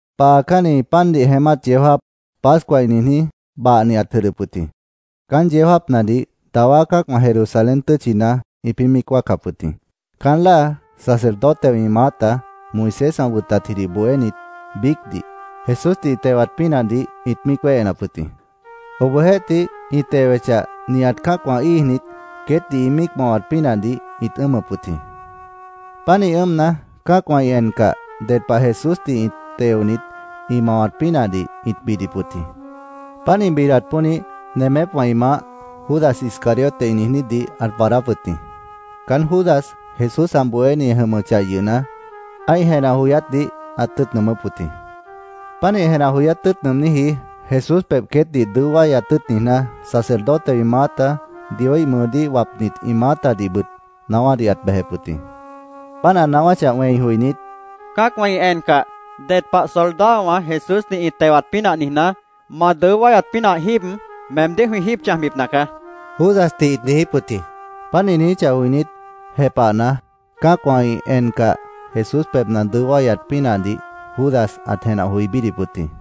Paacánni pandih jeémát yeó jáap, Pascua ĩ niijní, bahnibit ãt jʉdhdʉp wʉt jĩ. Caán yeó jáapnadih dawá cã́acwã Jerusalén tʉ́tchina ĩpĩ́ míic wáacap wʉt jĩ. Caán láa sacerdotewã ĩ maáta, Moisés ã wʉtatjidih bohénit biícdih, Jesúsdih ĩ tewat pínahdih ĩt míic wéhenap wʉt jĩ. Obohjeéhtih, ĩ tewechah, nihat cã́acwã íijnit, queétdih ĩ míic mawat pínahdih ĩt ʉ́ʉmʉp wʉt jĩ. Pánih ʉ́ʉmna, cã́acwã ĩ encah, ded pah Jesúsdih teonit, ĩ mawat pínahdih ĩt bidip wʉt jĩ. Páant ĩ bidat pónih, nemépwã ĩ maáh, Judas, Iscariote ĩ niijnídih ãt waadáp wʉt jĩ. Caán Judas, Jesús ã bohéni ã jʉmʉchah yʉhna, ã́ih jenah joyátdih ãt tʉ́ʉt nʉʉmʉ́p wʉt jĩ. Pánih jenah joyát tʉ́ʉt nʉʉmníji Jesús pebh queétdih dʉó wáyat tʉ́ʉt niijná, sacerdotewã ĩ maáta, Dioíh mʉʉdíh wapnit ĩ maátadihbʉt naáwádih ãt bejep wʉt jĩ. Páant ã naáwáchah wẽi joinít, —Cã́acwã ĩ encah, ded pah soldadowã Jesúsdih ĩ tewat pínah niijná, ma dʉó wáyat pínah jíib, meemdíh jwĩ jíib chãjbipna caá, Judasdih ĩt niijíp wʉt jĩ. Páant ĩ niijíchah joinít, jepahna, cã́acwã ĩ encah, Jesús pebhna ã dʉó wáyat pínahdih Judas ãt jenah joi bídip wʉt jĩ.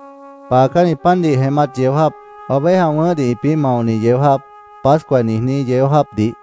Paacánni pandih jeémát yeó jáap, oveja wʉ̃ʉ́hdih ĩpĩ́ maoni yeó jáap, Pascua ĩ niijní yeó jáapdih,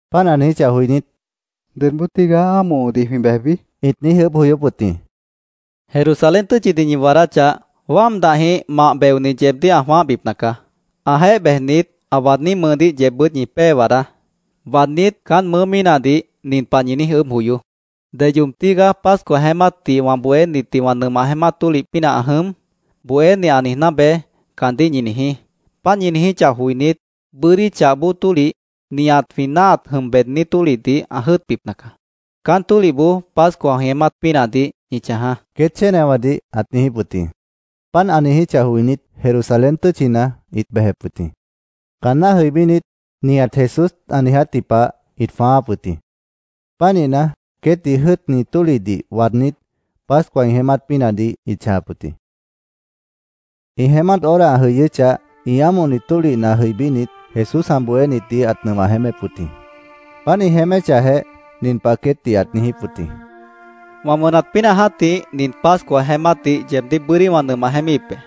Páant ã niijíchah joinít, —¿Dedjĩh tigaá ámohodih jwĩ bejbi? ĩt niíj ʉʉ́bh joyóp wʉt jĩ. —Jerusalén tʉ́tchidih ñi waadáchah, wáam dahjĩh mah beoni yeebdíh ã jwãáhbipna caá. Ãjeéh bejnit, ã waadní mʉʉdíh yeebbʉ́t ñi pée waadá. Waadnít, caán mʉʉ́ mínahdih nin pah ñi niíj ʉʉ́bh joyoó: ‘ “¿Deyoob tígaá Pascua jeémátdih wã bohénitdih wã nʉmah jeémát tólih pínah ã jʉm?” Bohéni ã niijná beé’, caandíh ñi niijí. Páant ñi niijíchah joinít, bʉ́dí chah bóo tólih, nihat jwĩ náahat jʉm beední tólihdih ã jʉ́ʉtbipna caá. Caán tólihboó Pascua jwĩ jeémát pínahdih ñi chãjaá, queét chénewãdih ãt niijíp wʉt jĩ. Páant ã niijíchah joinít, Jerusalén tʉ́tchina ĩt bejep wʉt jĩ. Caanná jʉibínit, nihat Jesús ã niijátji pah ĩt jwãááp wʉt jĩ. Pánihna, queétdih jʉ́ʉtni tólihdih waadnít, Pascua ĩ jeémát pínahdih ĩt chãjap wʉt jĩ. Ĩ jeémát hora ã jʉyʉ́chah, ĩ ámohni tólihna jʉibínit, Jesús ã bohénitdih ãt nʉmah jeémép wʉt jĩ. Páant ĩ jeéméchahjeh, nin pah queétdih ãt niijíp wʉt jĩ: —¡Wã wʉnat pínah jã́tih, nin Pascua jeémátdih yeebdíh bʉ́dí wã nʉmah jeémíhip be!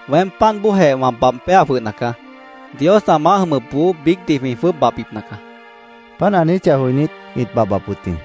Weém páant bóojeh wã babh péa jwʉhna caá. Dios ã maáh jʉmʉpboó biícdih jwĩ jwʉ́ʉb babhbipna caá, Jesús ãt niijíp wʉt jĩ. Páant ã niijíchah joinít, ĩt babhbap wʉt jĩ.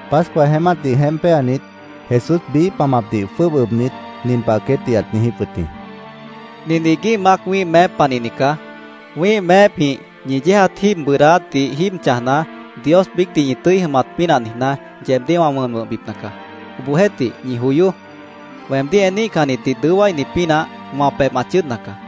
Pascua jeémátdih jeémp péanit, Jesús biíh pamapdih jwʉ́ʉb ʉbnit, nin pah queétdih ãt niijíp wʉt jĩ: —Nin iguíh mac wĩ́ih meép panihni caá. Wĩ́ih meépjĩh ñi yéejat jíib bʉʉdáátdih jíib chãjna, Dios biícdih ñi tʉ́i jʉmat pínah niijná, yeebdíh wã wʉn wʉ̃hbipna caá. Obohjeéhtih, ñi joyoó. Weemdíh eníhcannitdih dʉó wáini pínah wã pebh ã chʉ́ʉdna caá.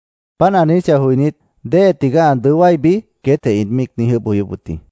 Páant ã niijíchah joinít, “¿Déhe tigaá ã dʉó wáibi?” queétjeh ĩt míic niíj ʉʉ́bh joyóp wʉt jĩ.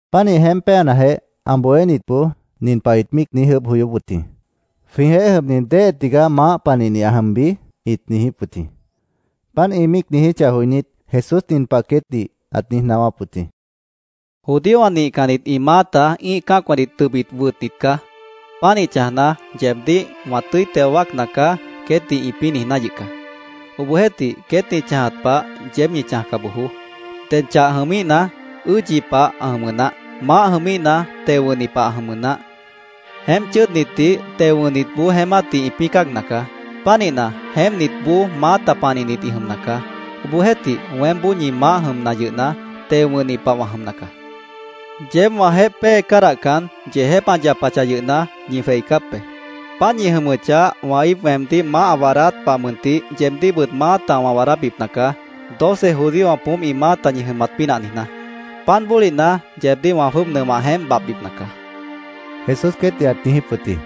Pánih jeémpnajeh, ã bohénitboó nin pah ĩt míic niíj ʉʉ́bh joyóp wʉt jĩ: “¿Jwĩjeéh jʉmni déhe tigaá maáh panihni ã jʉmbi?” ĩt niijíp wʉt jĩ. Páant ĩ míic niijíchah joinít, Jesús nin pah queétdih ãt niíj naáwáp wʉt jĩ: “Judíowã nihcannit ĩ maáta ĩ́ih cã́acwãdih tʉbit wʉtnit caá. Pánih chãjna, ‘Yeebdíh wã tʉ́i teo wáacna caá’, queétdih ĩpĩ́ niijná yʉh caá. Obohjeéhtih, queét ĩ chãjat pah, yeéb ñi chãjca bojoó. Ded chah jʉmíhna, ʉ́ʉdyi pah ã jʉmʉ naáh. Maáh jʉmíhna, teo wʉ̃hni pah ã jʉmʉ naáh. Jeémp chʉ́ʉdnitdih teo wʉ̃hnitboó jeémátdih ĩpĩ́ cáagna caá. Pánihna, jeémpnitboó maáta panihnit ĩ jʉmna caá. Obohjeéhtih, weémboó ñi Maáh jʉmna yʉhna, teo wʉ̃hni pah wã jʉmna caá. “Yeéb wãjeéh pée cádahcan, yeejép ã yapachah yʉhna, ñi jweicáp be. Páant ñi jʉmʉchah, wã íip weemdíh maáh ã waadáát pah mʉntih, yeebdíhbʉt maáta wã waadábipna caá, doce judíowã poómp ĩ maáta ñi jʉmat pínah niijná. Páant bólihna yeebdíh wã jwʉ́ʉb nʉmah jeémp babhbipna caá”, Jesús queétdih ãt niijíp wʉt jĩ.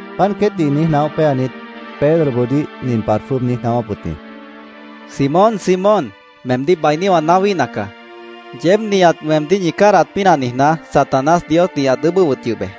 Páant queétdih niíj naóh péanit, Pedroboodíh nin pah ãt jwʉ́ʉb niíj naáwáp wʉt jĩ: —Simón, Simón, meemdíh bainí wã naáwíhna caá. Yeéb nihat weemdíh ñi cádahat pínah niijná, Satanás Diosdih ãt ʉʉ́bʉ́p wʉt yʉh be.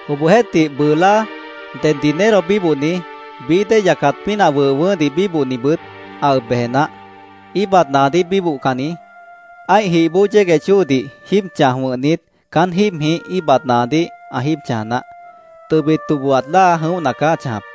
—Obohjeéhtih, bʉʉ láa ded dinero bíbohni, bií dée yacat pínah wʉh wʉʉ́hdih bíbohnibʉt ã ʉb beje naáh. Íibat naadíh bíbohcanni ã́ih jih bóo yégueh chóodih jíib chãj wʉ̃hnit, caán jíibjĩh íibat naadíh ã jíib chãja naáh. Tʉbit tobohat láa jʉ̃óhna caá ã chãjap.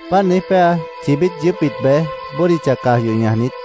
Páant niíj péa, chibít yʉʉ́pbit bej, bódicha caj yoh ñajnit,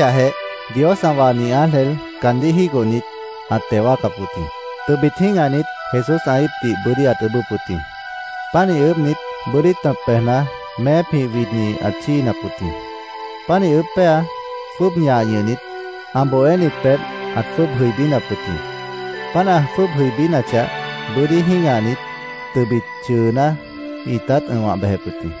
Páant ã niíj ʉʉ́bʉ́chahjeh, Dios ã wahni ángel caandíh jígohnit, ãt teo wáacap wʉt jĩ. Tʉbit jĩ́gahnit, Jesús ã íipdih bʉ́dí ãt ʉʉ́bʉ́p wʉt jĩ. Pánih ʉʉ́bhnit, bʉ́dí tʉ̃p bejna, meépjĩh widni ãt chíinap wʉt jĩ. Pánih ʉʉ́bh péa, jwʉ́ʉb ñah ñʉhnit, ã bohénit pebh ãt jwʉ́ʉb jʉibínap wʉt jĩ. Páant ã jwʉ́ʉb jʉibínachah, bʉ́dí jĩ́gahnit, tʉbit chʉʉná, ĩtát ʉ̃wah bejep wʉt jĩ.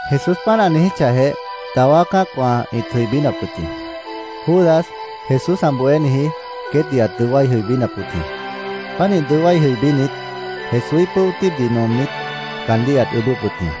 Jesús páant ã niijíchahjeh, dawá cã́acwã ĩt jʉibínap wʉt jĩ. Judas, Jesús ã bohéniji, queétdih ãt dʉó wái jʉibínap wʉt jĩ. Pánih dʉó wái jʉibínit, Jesúíh pʉ́o tíibdih nomnit, caandíh ãt ʉʉ́bʉ́p wʉt jĩ.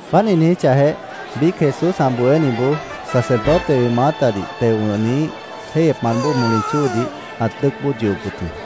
Páant ĩ niijíchahjeh, biíc Jesús ã bohéniboó sacerdotewã ĩ maáhdih teo wʉ̃hniíh jéihyepmant bóo moli chóodih ãt dʉ́ʉc bóod yohop wʉt jĩ.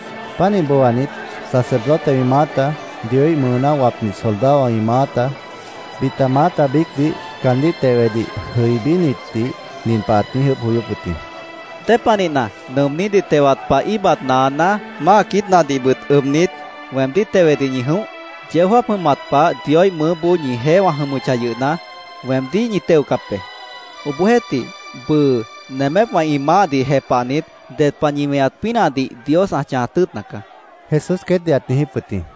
Pánih booanit, sacerdotewã ĩ maáta, Dioíh mʉʉdíh wapnit soldadowã ĩ maáta, bita maáta biícdih caandíh tewedih jʉibínitdih nin pah ãt niíj ʉʉ́bh joyóp wʉt jĩ: —¿Dépanihna nʉʉmnídih tewat pah íibat naaná, máa quiítnadihbʉt ʉbnit, weemdíh tewedih ñi jʉ̃óh? Yeó jáap jʉmat pah Dioíh mʉʉ́boó ñijeéh wã jʉmʉchah yʉhna, weemdíh ñi teocap be. Obohjeéhtih, bʉʉ nemépwã ĩ maáhdih jepahnit, ded pah ñi weñat pínahdih Dios ã chãjat tʉ́ʉtna caá, Jesús queétdih ãt niijíp wʉt jĩ.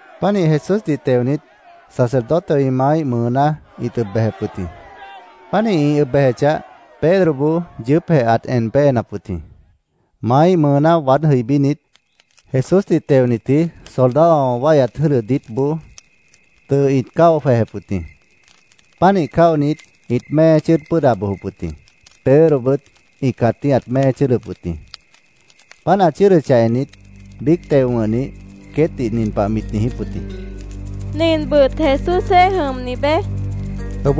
Pánih Jesúsdih teonit, sacerdotewã ĩ maáíh mʉʉná ĩt ʉb bejep wʉt jĩ. Páant ĩ ʉb bejechah, Pedroboó yʉʉ́pjeh ãt en péenap wʉt jĩ. Maáíh mʉʉná waád jʉibínit, Jesúsdih teonitji soldadowã wáihyat jʉ́dʉ diítboó tʉʉ ĩt cáo jwejep wʉt jĩ. Pánih cáonit, ĩt mée chʉ́ʉd pʉ́ʉda bojop wʉt jĩ. Pedrobʉt ĩ cãtíh ãt mée chʉ́ʉdʉp wʉt jĩ. Páant ã chʉ́ʉdʉchah ennit, biíc teo wʉ̃hnih queétdih nin pah mit niijíp wʉt jĩ: —Ninbʉt Jesúsjeéh jʉmni beé, mit niijíp wʉt jĩ.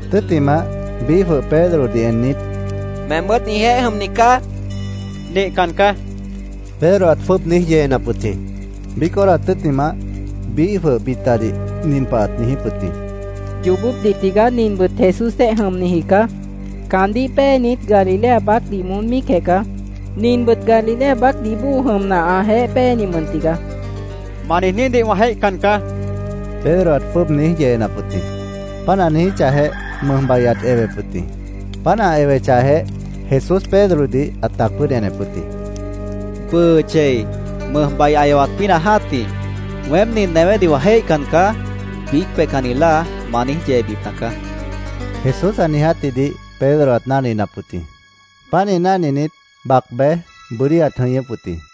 Tʉ́ttimah, biíh jwʉh Pedrodih ennit, —Meembʉ́t ĩjeéh jʉmni caá, ãt niijíp wʉt jĩ. —Nihcan caá, Pedro ãt jwʉ́ʉb niíj yeenap wʉt jĩ. Biíc hora tʉ́ttimah, biíh jwʉh bitadih nin pah ãt niijíp wʉt jĩ: —Yoobópdih tigaá ninbʉt Jesúsjeéh jʉmniji caá. Caandíh péenit Galilea baácdih moón míicjeh caá. Ninbʉt Galilea baácdih bóo jʉmna, ãjeéh péeni mʉn tigaá, ãt niijíp wʉt jĩ. —¡Ma niijnídih wã jéihcan caá! Pedro ãt jwʉ́ʉb niíj yeenap wʉt jĩ. Páant ã niijíchahjeh, mʉjbai ãt ewep wʉt jĩ. Páant ã ewechahjeh, Jesús Pedrodih ãt tac pʉ́ʉd enep wʉt jĩ. “Bʉʉ chei mʉjbai ã ewat pínah jã́tih, ‘Weém nin newédih wã jéihcan caá’, biíc peihcanni láa ma niíj yeebipna caá”, Jesús ã niijátjidih Pedro ãt náhninap wʉt jĩ. Pánih náhninit, bac bej, bʉ́dí ãt jʉñʉ́p wʉt jĩ.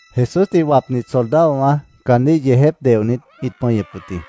Jesúsdih wapnit soldadowã caandíh yeejép deohnit, ĩt pʉñʉp wʉt jĩ.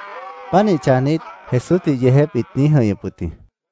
Pánih chãjnit, Jesúsdih yeejép ĩt niíj jʉ̃ihñʉp wʉt jĩ.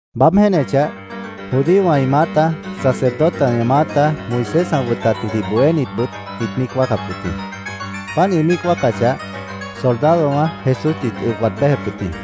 Baáb jéenechah, judíowã ĩ maáta, sacerdotewã ĩ maáta, Moisés ã wʉtatjidih bohénitbʉt ĩt míic wáacap wʉt jĩ. Páant ĩ míic wáacachah, soldadowã Jesúsdih ĩt ʉb waad béjep wʉt jĩ.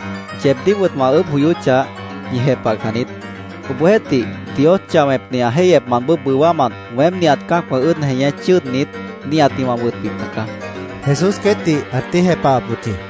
Yeebdíhbʉt wã ʉʉ́bh joyóchah, ñi jepahcan niít. Obohjeéhtih, Dios chah wẽpni ã jéihyepmant bóo bʉwámant weém nihat cã́acwã ʉ́ʉd jeñé chʉ́ʉdnit, nihatdih wã wʉtbipna caá, Jesús queétdih ãt niíj jepahap wʉt jĩ.